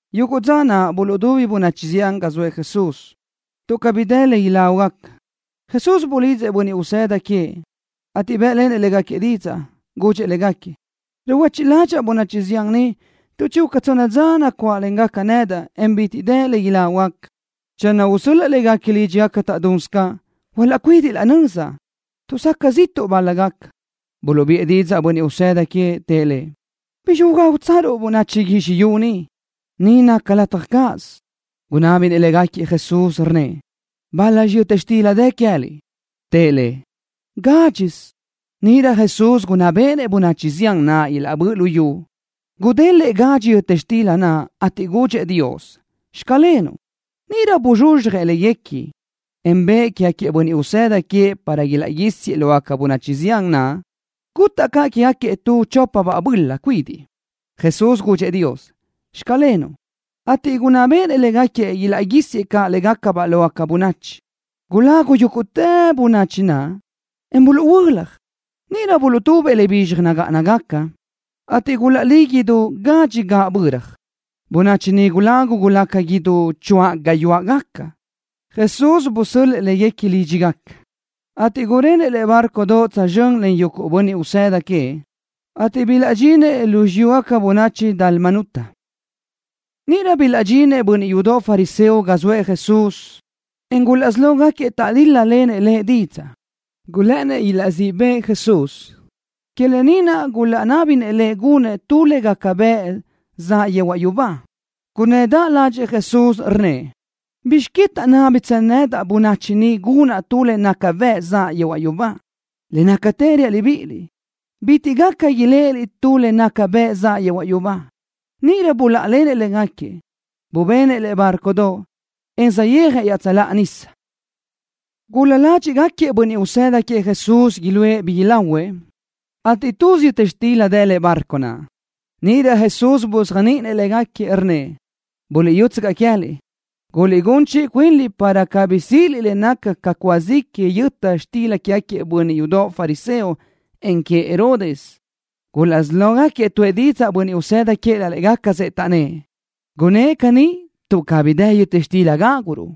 Yuguʼ dza naʼ buluʼdubi bönachi zián ga zoëʼ Jesús. Tuʼ cabí dë le ilágugaca, Jesús bulidzëʼ bönniʼ usëda queëʼ, ateʼ bë́ʼlenëʼ légaquiëʼ didzaʼ. Gudxëʼ légaquiëʼ: —Ruhuechiʼ ládxaʼa bönachi zián ni tuʼ chinaca tsonna dza nacuáʼlen nedaʼ ni, en bitiʼ dë le ilágugaca. Channö usö́l-laʼa léguequi lídxigaca taʼdunsö caʼ, hualaʼcuídiʼ laʼ nöza, tuʼ záʼgaca ziʼtuʼ bál-lagaca. Buluʼbiʼë didzaʼ bönniʼ usëda queëʼ, tëʼ Lëʼ: —¿Bizxi ugágutsaruʼ bönachi guizxi yu ni, ga ni naca lataj cáʼasö? Gunábinëʼ Jesús légaquiëʼ, rnnëʼ: —¿Bál-laxi yöta xtila dë queë́liʼ? Tëʼ Lëʼ: —Gádxisö. Níʼirö Jesús gunná béʼenëʼ bönachi zián naʼ ilaʼbö́ʼ lu yu. Gudélëʼë gadxi yöta xtila naʼ, ateʼ gudxëʼ Dios: “Xclenuʼ.” Níʼirö buzxuzxjëʼ léguequi, en bëʼë quégaquiëʼ bönniʼ usëda queëʼ para ilaʼguísiëʼ lógaca bönachi zián naʼ. Gutaʼ caʼ quégaquiëʼ tu chópabaʼ böla cuidiʼ. Jesús gudxëʼ Dios: “Xclenuʼ”, ateʼ gunná béʼenëʼ légaquiëʼ ilaʼguísiëʼ caʼ légacabaʼ lógaca bönachi. Gulagu yúguʼtë bönachi naʼ, en buluʼhuö́laj. Níʼirö buluʼtubëʼ le bizxaj nagáʼanagaca, ateʼ gulaʼlí idú gadxi gaʼböra. Bönachi naʼ gulagu gulaca idú ca choáʼ gayuáʼgaca. Jesús busöl-lëʼ léguequi lídxigaca, ateʼ gurenëʼ lëʼe bárcodoʼ tsözxö́n len yuguʼ bönniʼ usëda queëʼ, ateʼ bilaʼdxinëʼ lu xiyúgaca bönachi Dalmanuta. Níʼirö bilaʼdxinëʼ bönniʼ yudoʼ fariseo ga zoëʼ Jesús, en gulaʼsí lógaquiëʼ taʼdíl-lalenëʼ Lëʼ didzaʼ. Gulë́ʼënnëʼ ilaʼzíʼ bëʼë Jesús. Que lë ni naʼ gulaʼnábinëʼ Lëʼ gunëʼ tu le naca bëʼ zaʼ yehuaʼ yubá. Gunnëdaʼ ládxëʼë Jesús, rnnëʼ: —¿Bizx que taʼnábitsö bönachi ni nedaʼ gunaʼ tu le naca bëʼ zaʼ yehuaʼ yubá? Le nácatë reaʼ libíʼiliʼ, bitiʼ caʼ iléʼeliʼ tu le naca bëʼ zaʼ yehuaʼ yubá. Níʼirö buláʼalenëʼ légaquiëʼ. Bubenëʼ lëʼe bárcodoʼ, en saʼyéajëʼ iaʼtsöláʼa nísadoʼ. Gulal-la ládxiʼgaquiëʼ bönniʼ usëda queëʼ Jesús iluʼë bi ilahuëʼ, ateʼ tuz yöta xtila dë lëʼe bárcodoʼ naʼ. Níʼirö Jesús buzéajniʼinëʼ légaquiëʼ, rnnëʼ: —Buliʼyútsöcaʼ queë́liʼ. Guliʼgún chiʼi cuinliʼ para cabí síʼiliʼ le naca ca cúa zi que yöta xtila quégaquiëʼ bönniʼ yudoʼ fariseo, en queëʼ Herodes. Gulaʼsí lógaquiëʼ tuʼë didzaʼ bönniʼ usëda queëʼ laʼ légacasëʼ, taʼnnë́ʼ: —Gunnë́ʼ caní tuʼ cabí dë yöta xtila gáguruʼ.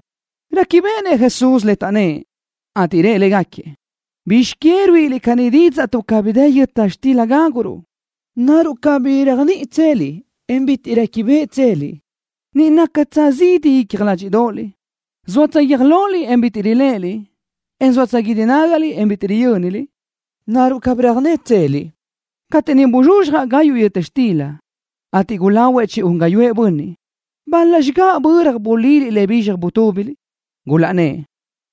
Réquibeʼenëʼ Jesús le taʼnnë́ʼ, ateʼ rëʼ légaquiëʼ: —¿Bizx que ruíʼiliʼ caní didzaʼ tuʼ cabí dë yöta xtila gáguruʼ? ¿Naruʼ cabí réajniʼitseliʼ, en bitiʼ réquibeʼitseliʼ? ¿Ni nácatsö zidi icja ládxiʼdoʼoliʼ? ¿Zóatsö guiö́j loliʼ, en bitiʼ riléʼeliʼ, en zóatsö guídi nágaliʼ, en bitiʼ riyö́niliʼ? ¿Naruʼ cabí röjnétseliʼ? Cateʼ niʼ buzxuzxjaʼ gayuʼ yöta xtila, ateʼ gulahuëʼ chi-un gáyuʼë bönniʼ, ¿bál-laxi gaʼböra buliliʼ le bizxaj butúbiliʼ? Gulaʼnnë́ʼ: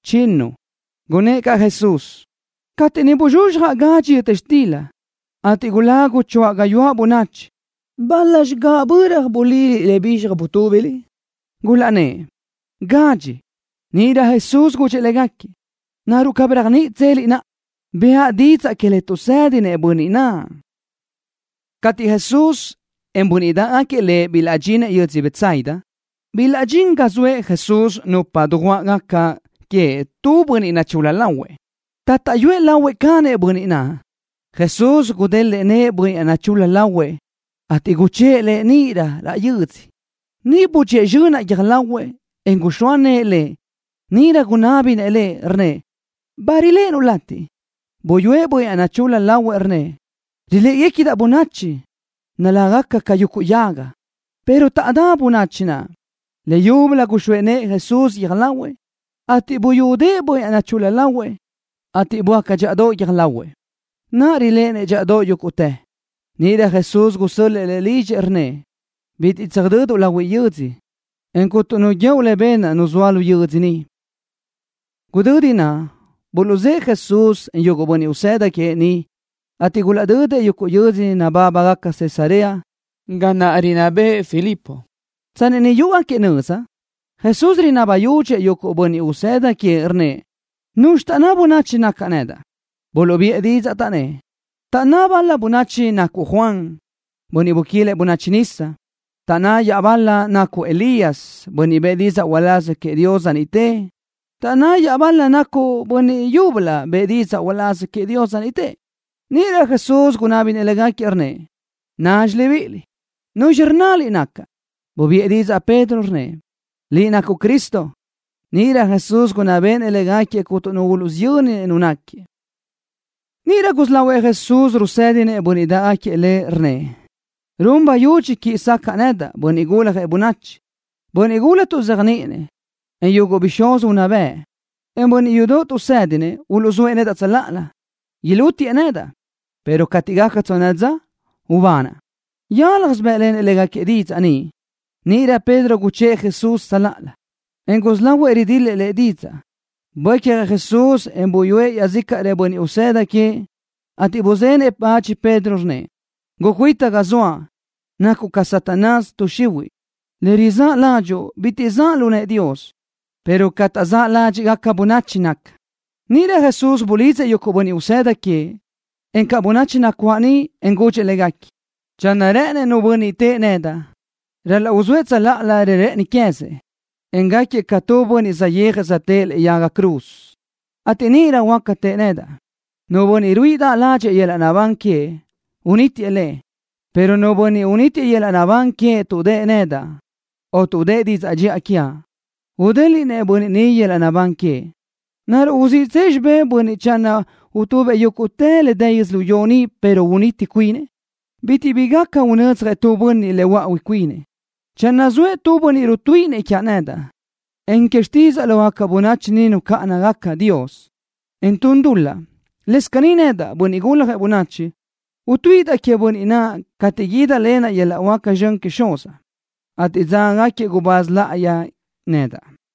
—Chinnu. Gunnë́ʼ caʼ Jesús: —Cateʼ niʼ buzxuzxjaʼ gadxi yöta xtila, ateʼ gulagu choáʼ gayuáʼ bönachi, ¿bál-laxi gaʼböra buliliʼ le bizxaj butúbiliʼ? Gulaʼnnë́ʼ: —Gadxi. Níʼirö Jesús gudxëʼ légaquiëʼ: —¿Naruʼ cabí réajniʼitseliʼ naʼa, bëʼa didzaʼ que le tuʼsë́dinëʼ bönniʼ naʼ? Cateʼ Jesús, en bönniʼ dáʼgaquiëʼ Lëʼ bilaʼdxinëʼ yödzö Betsaida, bilaʼdxín ga zoëʼ Jesús nupa dujuáʼgaquiëʼ queëʼ tu bönniʼ nachul-la lahuëʼ. Taʼtáʼyuëʼ lahuëʼ canëʼ bönniʼ naʼ. Jesús gudélëʼë nëʼë bönniʼ naʼ nachul-la lahuëʼ, ateʼ guchë́ʼë lëʼ níʼilö raʼ yödzö. Niʼ budxíëʼ zxönaʼ guiö́j lahuëʼ, en guxóa nëʼë lëʼ. Níʼirö gunábinëʼ lëʼ, rnnëʼ: —¿Ba riléʼenuʼ latiʼ? Buyúëʼ bönniʼ naʼ nachul-la lahuëʼ, rnnëʼ: —Riléʼegacadaʼ bönachi, naláʼgaca ca yuguʼ yaga, pero taʼdá bönachi naʼ. Leyúbölö guxóa nëʼë Jesús guiö́j lahuëʼ, ateʼ buyúdëʼë bönniʼ naʼ nachul-la lahuëʼ, ateʼ böácatë dxíʼadoʼ guiö́j lahuëʼ. Naʼa riléʼenëʼ dxíʼadoʼ yúguʼtë. Níʼirö Jesús gusö́l-lëʼë lëʼ lidxëʼ, rnnëʼ: —Bitiʼ tsöjdöduʼ lahuiʼ yödzö, en cuntu nu guíoʼ le benaʼ nu zoa lu yödzö ni. Gudödi naʼ, buluʼzë́ʼë Jesús, en yuguʼ bönniʼ usëda queëʼ niʼ, ateʼ gulaʼdödëʼ yuguʼ yö́dzödoʼ nabábagaca Cesarea, ga naʼ rinná bëʼë Filipo. Tsanni niʼ yúʼugaquiëʼ nöza, Jesús rinabi yudxëʼ yuguʼ bönniʼ usëda queëʼ, rnnëʼ: —¿Nuzxi taʼnná bönachi nacaʼ? Buluʼbiʼë didzaʼ, taʼnnë́ʼ: —Taʼnná bal-la bönachi nacuʼ Juan, bönniʼ buquilëʼ bönachi nisa. Taʼnná iaʼbal-la nacuʼ Elías, bönniʼ bëʼë didzaʼ uláz queëʼ Dios dza niʼte. Taʼnná iaʼbal-la nacuʼ bönniʼ yúbölö bëʼë didzaʼ uláz queëʼ Dios dza niʼte. Níʼirö Jesús gunábinëʼ légaquiëʼ, rnnëʼ: —Nazxi libíʼiliʼ, ¿nuzxi rnnaliʼ nacaʼ? Bubiʼë didzaʼ Pedro, rnnëʼ: —Liʼ nacuʼ Cristo. Níʼirö Jesús gunná béʼenëʼ légaquiëʼ cuntu nu uluʼsiyönnëʼ Nu náquiëʼ. Níʼirö gusí lahuëʼ Jesús rusë́dinëʼ bönniʼ dáʼgaquiëʼ Lëʼ, rnnëʼ: —Run bayudxi quiʼi sacaʼa nedaʼ, Bönniʼ Guljëʼ Bönachi. Bönniʼ gula tuʼzéajniʼinëʼ, en yuguʼ bixúz unná bëʼ, en bönniʼ yudoʼ tuʼsë́dinëʼ uluʼzóëʼ nedaʼ tsöláʼalö. Ilútiëʼ nedaʼ, pero cateʼ gaca tsonna dza ubanaʼ. Yálajsö bë́ʼlenëʼ légaquiëʼ didzaʼ ni. Níʼirö Pedro guchë́ʼë Jesús tsöláʼalö, en gusí lahuëʼ ridil-lëʼ lëʼ didzaʼ. Buécjëʼ Jesús, en buyúëʼ iaʼzícaʼrëʼ bönniʼ usëda queëʼ, ateʼ buzenëʼ bach Pedro, rnnëʼ: —Gucuita ga zoaʼ. Nacuʼ ca Satanás, tuʼ xihuiʼ. Le rizáʼ ládxuʼu bitiʼ zaʼ lu nëʼë Dios, pero ca taʼzáʼ ládxiʼgaca bönachi naca. Níʼirö Jesús bulidzëʼ yuguʼ bönniʼ usëda queëʼ, encaʼ bönachi nacuáʼ niʼ, en gudxëʼ légaquiëʼ: —Channö rë́ʼënëʼ nu bönniʼ tëʼë nedaʼ, ral-laʼ uzóëʼ tsöláʼalö le rë́ʼëni quézinëʼ, en gáquiëʼ ca tu bönniʼ saʼyéajëʼ söjtë́ʼë lëʼe yaga cruz, ateʼ níʼirö huáca tëʼë nedaʼ. Nu bönniʼ ruíʼidaʼ ládxëʼë yöl-laʼ naʼbán queëʼ, unítiëʼ le, pero nu bönniʼ unítiëʼ yöl-laʼ naʼbán queëʼ tuʼ dëʼë nedaʼ, o tuʼ dëʼë didzaʼ dxiʼa quiaʼ, udéliʼnëʼ bönniʼ ni yöl-laʼ naʼbán queëʼ. ¿Naruʼ uziʼtsëʼ xibé tu bönniʼ channö utubëʼ yúguʼtë le dë yödzölió ni, pero uniti cuinëʼ? Bitiʼ bi gaca unödzjëʼ tu bönniʼ le huöáʼui cuinëʼ. Channö zoëʼ nu bönniʼ rutuíʼinëʼ quiaʼ nedaʼ, en que xtídzaʼa lógaca bönachi ni nucáʼanagaca Dios, en tun dul-laʼ, lëscaʼ caní nedaʼ, Bönniʼ Guljëʼ Bönachi, utuíʼidaʼ queëʼ bönniʼ naʼ cateʼ guídalenaʼ yöl-laʼ huáca zxön queëʼ Xuzaʼ, ateʼ dzágagaquiëʼ gubáz láʼayi nedaʼ.